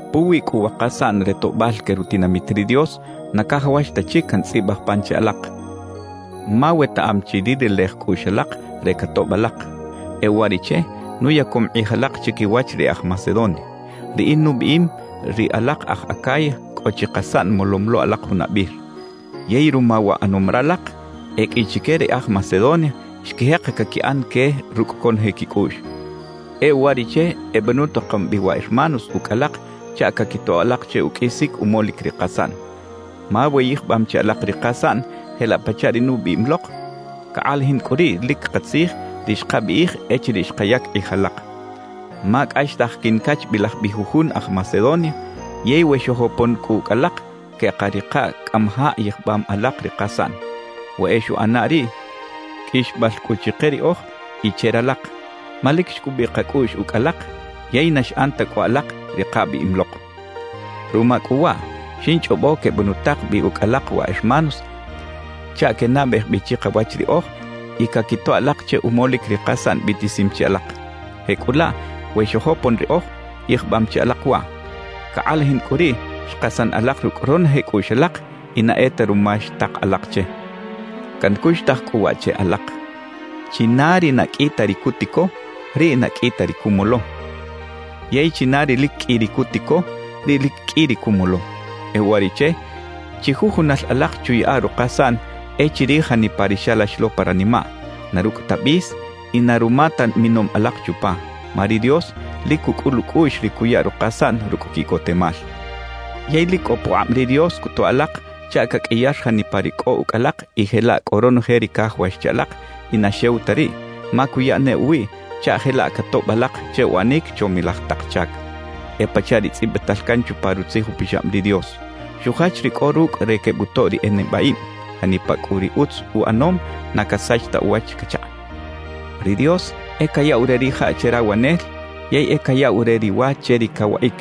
Puwi cꞌu wa kasaꞌn re toꞌbal que rutinamit ri Dios, na cajawax ta chic cantzꞌibaj pan che alak, ma wetaꞌam chi ri relej cꞌuꞌx alak re catoꞌb alak. E uwariꞌche nuyacom kꞌij alak chiquiwach ri e aj Macedonia. Riꞌin nubiꞌim, ri alak aj Acaya cꞌo chi kasaꞌn molom lo alak junabir. Yey ruma wa ꞌanom ralak, e qꞌui chique ri e aj Macedonia xquijek caquiꞌan que rucꞌ ronoje quicꞌuꞌx. E uwariꞌche ebenutakom bi wa hermanos ucꞌ alak chaꞌ caquitoꞌ alak che uqꞌuisic umolic ri kasaꞌn. Ma we yijbam chi alak ri kasaꞌn jelaꞌ pachaꞌ ri nubiꞌim lok, cakꞌalajin cꞌu riꞌ lic katzij ri xkabiꞌij echiriꞌ xkayac kꞌij alak. Ma cꞌaxtaj quincachbilaj bi jujun aj Macedonia yey we xojopon cꞌu ucꞌ alak, queꞌkarikaꞌ cꞌamajaꞌ yijbam alak ri kasaꞌn. We e xuꞌana riꞌ, qꞌuixbal cꞌu chike riꞌoj y che ralak, ma lic xcubiꞌ kacꞌuꞌx ucꞌ alak yey na xꞌan ta cꞌu alak ri kabiꞌim lok. Ruma cꞌu waꞌ, xinchꞌobo quebenutak bi ucꞌ alak wa hermanos chaꞌ quenabej bi chikawach riꞌoj y caquitoꞌ alak che umolic ri kasaꞌn biꞌtisim chi alak. Jecꞌulaꞌ we xojopon riꞌoj, yijbam chi alak waꞌ. Cakꞌalajin cꞌu riꞌ xkasan alak rucꞌ ronoje cꞌuꞌx alak y na e ta ruma xtak alak che. Cancuxtaj cꞌu waꞌ che alak: China ri na qꞌui ta ri cutico, riꞌ na qꞌui ta ri cumolo. Yey china ri lic qꞌui ri cutico, riꞌ lic qꞌui ri cumolo. E uwariꞌche, chijujunal alak chuyaꞌa rukasaꞌn e chirij janipa ri xalax lo pa ranimaꞌ, na rucꞌ ta bis y na ruma ta minom alak chupa. Ma ri Dios lic cucꞌul ucꞌuꞌx ri cuya rukasaꞌn rucꞌ quiꞌcotemal. Yey lic cꞌo pukꞌab ri Dios cutoꞌ alak chaꞌ caqꞌuiyar janipa ri cꞌo ucꞌ alak y jelaꞌ cꞌo ronoje ri cajawax che alak y na xew ta riꞌ, ma cuya ne uwiꞌ chaꞌ jelaꞌ catoꞌb alak che uꞌanic chomilaj tak chac. E pachaꞌ ri tzꞌibital can chupa Rutzij Upixab ri Dios: Xujach ri cꞌo rucꞌ re quebutoꞌ ri nibaꞌib; janipa cꞌu ri utz uꞌanom na casach ta uwach cachaꞌ. Ri Dios e cayaꞌw re rijaꞌ che rawanel yey e cayaꞌw re ri wa che ri cawaꞌic.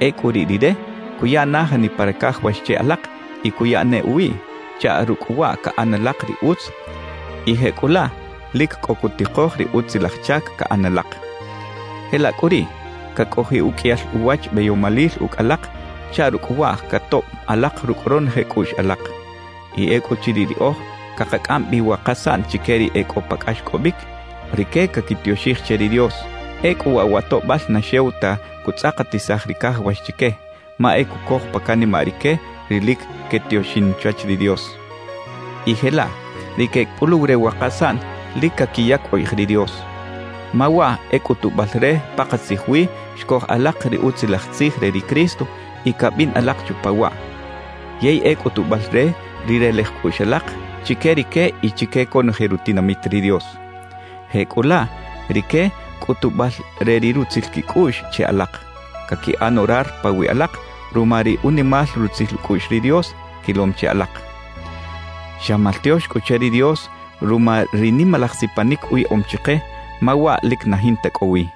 Ecꞌu riꞌ Rire cuya na janipa ri cajawax che alak y cuya ne uwiꞌ, chaꞌ rucꞌ waꞌ caꞌan alak ri utz y jecꞌulaꞌ lic cꞌo cutikoj ri utzilaj chac caꞌan alak. Jelaꞌ cꞌu riꞌ, cacꞌojiꞌ uqꞌuiyal uwach beyomalil ucꞌ alak chaꞌ rucꞌ waꞌ catoꞌb alak rucꞌ ronoje cꞌuꞌx alak. Y ecꞌuchiriꞌ riꞌoj cakacꞌam bi wa kasaꞌn chique ri e cꞌo pa cꞌaxcꞌobic, rique caquitioxij che ri Dios. Ecꞌu waꞌ wa toꞌbal na xew ta cutzꞌakatisaj ri cajawax chique, ma e cucoj pa canimaꞌ rique ri lic quetioxin chwach ri Dios y jelaꞌ ri quecꞌuluw re wa kasaꞌn lic caquiyac ukꞌij ri Dios. Ma waꞌ e cꞌutubal re pakatzij wi xcoj alak ri Utzilaj Tzij re ri Cristo y cabin alak chupa waꞌ, yey e cꞌutubal re ri relej cꞌuꞌx alak chique rique y chique conoje rutinamit ri Dios. Jecꞌulaꞌ rique cꞌutubal re ri rutzil quicꞌuꞌx che alak, caquiꞌan orar pawiꞌ alak ruma ri unimal rutzil ucꞌuꞌx ri Dios quilom che alak. ¡Xa maltiox cꞌu che ri Dios ruma ri nimalaj sipanic uyaꞌom chike, ma waꞌ lic na jinta cꞌo wi!